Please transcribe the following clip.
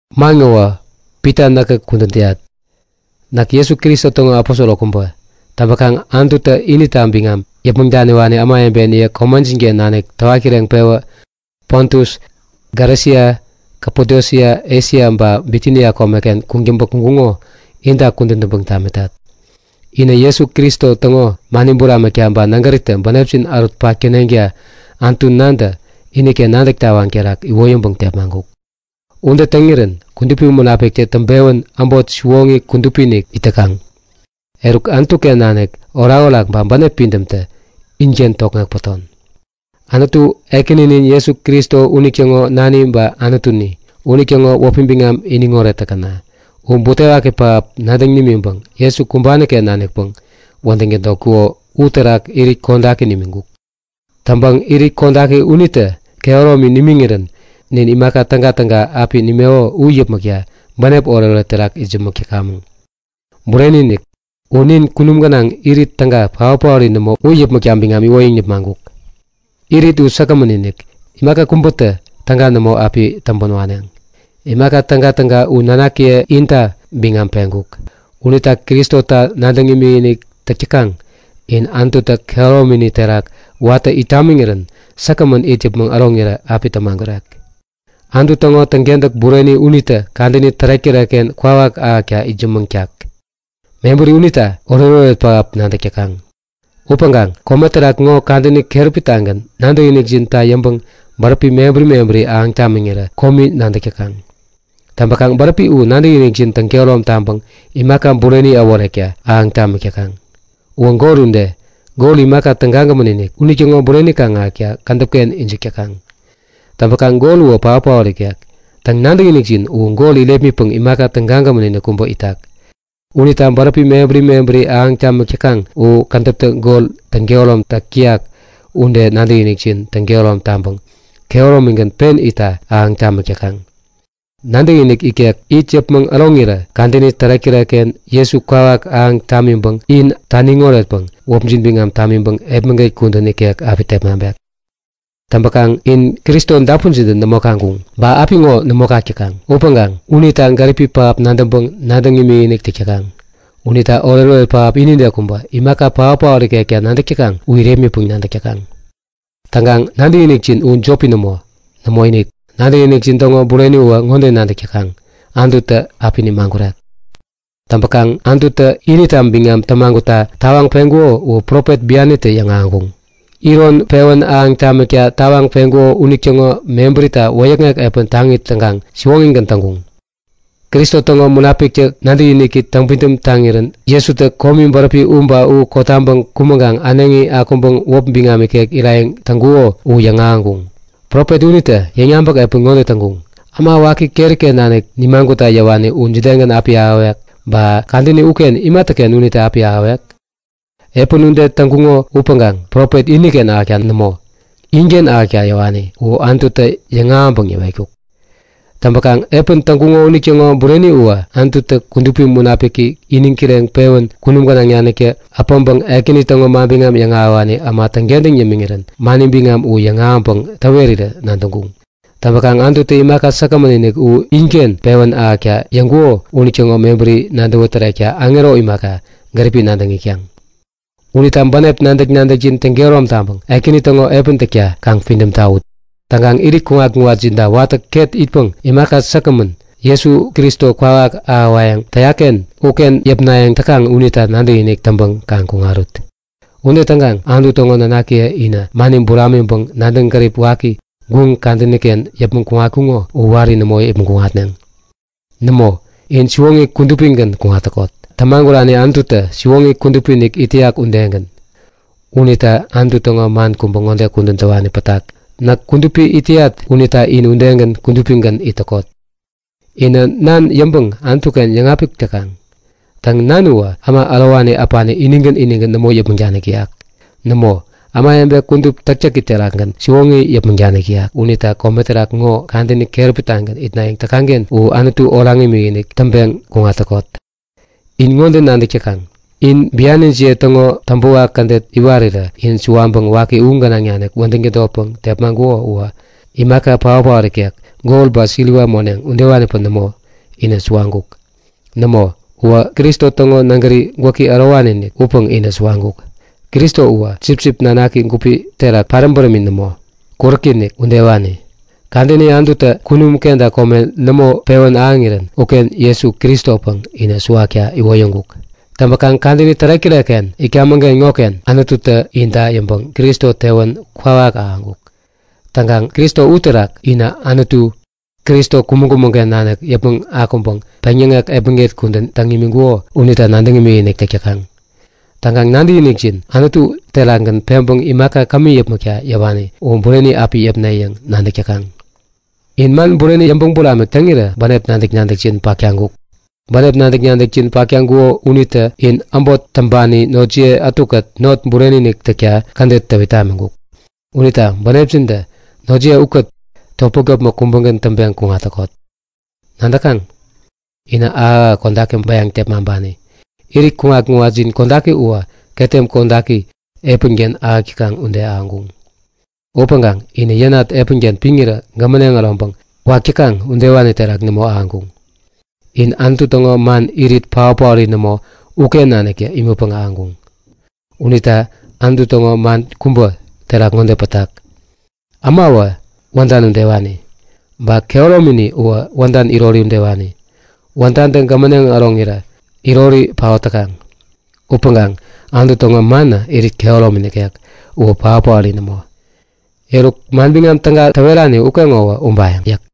Man ŋowä Pita näkä kudän täyat. Näk Jesu Kristo täŋo aposoro kubä. Täŋpäkaŋ Anututä inita biŋam yäpmäŋ daniwani ämawebeniye komejin-ken nanik täwat kireŋpewä Pontus, Galesia, Kapadosia, Esia ba Bitinia komeken kuŋtäŋpä kuŋkuŋo inta kudän täŋpäŋ tamitat. Inä Jesu Kristo täŋo mani buramikta ba nägäritä bänepjin ärutpak täneŋta Anutu Nantä iniken nadäk tawaŋ terak iwoyäŋpäŋ tepmaŋkuk. Ude täŋirän Kudupi Munapikitä täŋpewän äbot siwoŋi kudupi-inik it täkaŋ. Eruk, Anutu-ken nanik orakorak ba bänep pidämtä inken tokŋek päton. Anutu, Ekäninin Jesu Kristo unitäŋo nani ba Anutuni, unitäŋo wäpi biŋam iniŋoret täkäna! U butewaki pähap nadäŋ nimiŋpäŋ Jesu kumbani-ken nanikpäŋ wädäŋ tädotkuko uterak irit kodaki nimiŋkuk. Täŋpäŋ irit kodaki unitä kehäromi nimiŋirän nin imaka tägatäga api nimeko u yäpmäkta bänep oretoret terak itsämäŋkamäŋ. Bureni-inik! U nin kunum gänaŋ Irit täga, paot-paori nämo u yäpmäkta biŋam iwoyäŋ nipmaŋkuk. Irit u säkgämän-inik, imaka kubätä täga nämo api täŋpän waneŋ. Imaka tägatäga u nanakiye inta biŋam peŋkuk. Unita Kristota nadäŋ imikinik täk täkaŋ in Anututä kehäromini terak watä it tamiŋirän säkgämän it yäpmäŋ äroŋirä api tämagurek. Anutu täŋo täŋkentäk bureni unitä kadäni tärek-tärekken kwawak ahäkta itsämäŋ nimitak. Mebäri unita oretoret pähap nadäk täkaŋ. Upäŋkaŋ kome terak ŋo kadäni keräpi-tagän nadäkinikjinta yäŋpäŋ bäräpi mebäri mebäri ahäŋ tamiŋirä komi nadäk täkaŋ. Täŋpäkaŋ bäräpi u nadäkinikjin täŋkehärom taŋpäŋ imaka bureni äworewekta ahäŋ tamik täkaŋ. Uwä gol ude. Gol, imaka tägagämän unitäŋo bureni kaŋ-ahäkta kädäp-ken ijik täkaŋ. Täŋpäkaŋ gol uwä paotpaot ikek. Täŋ, nadäkinikjin u gol irepmitpäŋ imaka tägagämän-inik kubä itak. Unita bäräpi mebäri mebäri ahäŋ tamik täkaŋ u kädäptä gol täŋ-kehäromtak täyak ude nadäkinikjin täŋkehärom taŋpäŋ kehäromigän pen itta ahäŋ tamik täkaŋ. Nadäkinik ikek it yäpmäŋ äroŋirä kadäni tärek-tärekken, Jesu kwawak ahäŋ tamiŋpäŋ in taniŋ oretpäŋ wäpjin biŋam tamiŋpäŋ epmäget kudän ikek api tepmaŋpek. Täŋpäkaŋ in Kristo dapunjintä nämo kaŋkuŋ ba apiŋo nämo kak täkaŋ upäŋkaŋ unita gäripi pähap nadäŋpäŋ nadäŋ imikinik täk täkaŋ. Unita oretoret pähap inide kubä, imaka paotpaot ikekta nadäk täkaŋ u irepmitpäŋ nadäk täkaŋ. Täŋkaŋ nadäkinikjin u jopi nämo. Nämoinik, nadäkinikjin täŋo bureniwä ŋode nadäk täkaŋ; Anututä api nimagurek. Täŋpäkaŋ Anututä inita biŋam tämagutta tawaŋ peŋkuko u profet bianitä yäŋahäŋkuŋ. Iron pewän ahäŋ tamikta tawaŋ peŋkuko unitäŋo mebärita wäyäkŋek epän taŋi täŋkaŋ siwoŋigän täŋkuŋ. Kristo täŋo Munapiktä nadäk-nadäki täŋpidäm taŋirän Jesutä komi bäräpi u ba u kotaŋpäŋ kumäŋkaŋ äneŋi akuŋpäŋ wäpi biŋam ikek irayäŋ täŋkuko u yäŋahäŋkuŋ. Profet unitä yäŋyabäk epän ŋode täŋkuŋ; Äma waki keri-ken nanik nimagutta yäwani u jidegän api ahäwek, ba kadäni uken imatäken unitä api ahäwek? Epän ude täŋkuŋo upäŋkaŋ profet iniken ahäkta nämo, inken ahäkta yäwani u Anututä yäŋahäŋpäŋ yäwetkuk. Täŋpäkaŋ epän täŋkuŋo unitäŋo bureni uwä Anututä Kudupi Munapiki iniŋ kireŋpewän kunum gänaŋ naniktä äpäŋpäŋ Ekäni täŋo manbiŋam yäŋahäwani äma täŋkentäŋ yämiŋirän mani biŋam u yäŋahäŋpäŋ täwerirä nadäŋkuŋ. Täŋpäkaŋ Anututä imaka säkgämän u inken pewän ahäkta yäŋkuko unitäŋo mebäri nadäwä tärekta aŋero imaka, gäripi nadäŋ itkaŋ. Unita bänep nadäk-nadäkjin täŋkehärom taŋpäŋ Ekäni täŋo epän täkta kaŋ pidäm tawut. Täŋkaŋ irit kuŋat-kuŋatjinta watä ket itpäŋ imaka säkgämän, Jesu Kristo kwawak ahäwayäŋ täyak-ken uken yäpnayäŋ täkaŋ unita nadäkinik täŋpäŋ kaŋ kuŋarut. Ude täŋkaŋ Anutu täŋo nanakiye inä mani buramiŋpäŋ nadäŋ gärip waki, guŋ kadäni-ken yäpmäŋ kuŋatkuŋo u wari nämo yäpmäŋ kuŋatneŋ. Nämo, in siwoŋi kudupigän kuŋat täkot, tämagurani Anututä siwoŋi kudupi-inik it täyak udegän. Unita Anutu täŋo man kubä ŋode kudän täwani pätak; Näk kudupi itat unita in udegän kudupigän it täkot. Inä Nan yäŋpäŋ Anutu-ken yäŋapik täkaŋ. Täŋ, Nan uwä äma ärowani äpani inigän inigän nämo yäpmäŋ danik täyak. Nämo, ämawebe kudup täktäki terakgän siwoŋi yäpmäŋ danik täyak unita kome terak ŋo kadäni keräpi-tagän itnayäŋ täkaŋ-ken uwä Anutu oraŋ imikinik täŋpeŋ kuŋat täkot. In ŋode nadäk täkaŋ; In bianijiye täŋo täŋpäwak kädet iwarirä in suwaŋpäŋ waki u gänaŋ nanik wädäŋ tädotpäŋ tepmaŋkuko uwä, imaka paot-paori ikek, gol ba siliwa moneŋ udewanipäŋ nämo, inä suwaŋkuk. Nämo, uwä Kristo täŋo nägäri gwäki ärowani-inik upäŋ inä suwaŋkuk. Kristo uwä sipsip nanaki gupi terak paräm bärämi nämo, kuräki-inik udewani. Kadäni Anututä kunum kenta kome nämo pewän ahäŋirän uken Jesu Kristopäŋ in suwawekta iwoyäŋkuk. Täŋpäkaŋ kadäni tärek-tärekken itkamäŋ-ken ŋoken Anututä ninta yäŋpäŋ Kristo tewän kwawak ahäŋkuk. Täŋkaŋ Kristo uterak inä Anutu, Kristo kumäŋ-kumäŋ-ken nanik yäpmäŋ akuŋpäŋ peŋyäŋek epmäget kudän täŋ imiŋkuko unita nadäŋ imikinik täk täkaŋ. Täŋkaŋ nadäkinikjin Anutu terakgän peŋpäŋ imaka kämi yäpmäkta yäwani u bureni api yäpne yäŋ nadäk täkaŋ. In man bureni yäŋpäŋ buramik täŋirä bänep nadäk-nadäkjin pak taŋkuk. Bänep nadäk-nadäkjin pak täŋkuko unitä in äbot täŋpani notjiye ätukät not bureni-inik täkta kädet täwit tamiŋkuk. Unita bänepjintä notjiye ukät topmäk-topmäk kubägän täŋpeŋ kuŋat täkot. Nadäkaŋ? Inä ahäk-ahäk kodaki bäyaŋpäŋ tepmaŋpani. Irit kuŋat-kuŋatjin kodaki uwä ketem kodaki epänken ahäk täkaŋ ude ahäŋkuŋ. Upäŋkaŋ inä yänat epänken piŋirä gämäneŋ äroŋpäŋ wak täkaŋ udewani terak nämo ahäŋkuŋ. In Anutu täŋo man, irit paot-paori nämo uken naniktä imätpäŋ ahäŋkuŋ. Unita Anutu täŋo man kubä terak ŋode pätak; Ämawä wädan udewani. Ba kehäromini uwä wädan irot udewani. Wädantä gämäneŋ äroŋirä irori paot täkaŋ. Upäŋkaŋ Anutu täŋo manä irit kehäromi nikek. Uwä paot-paori nämo. Eruk, Manbiŋam Täga täwerani ukeŋowä ubayäŋ yäk.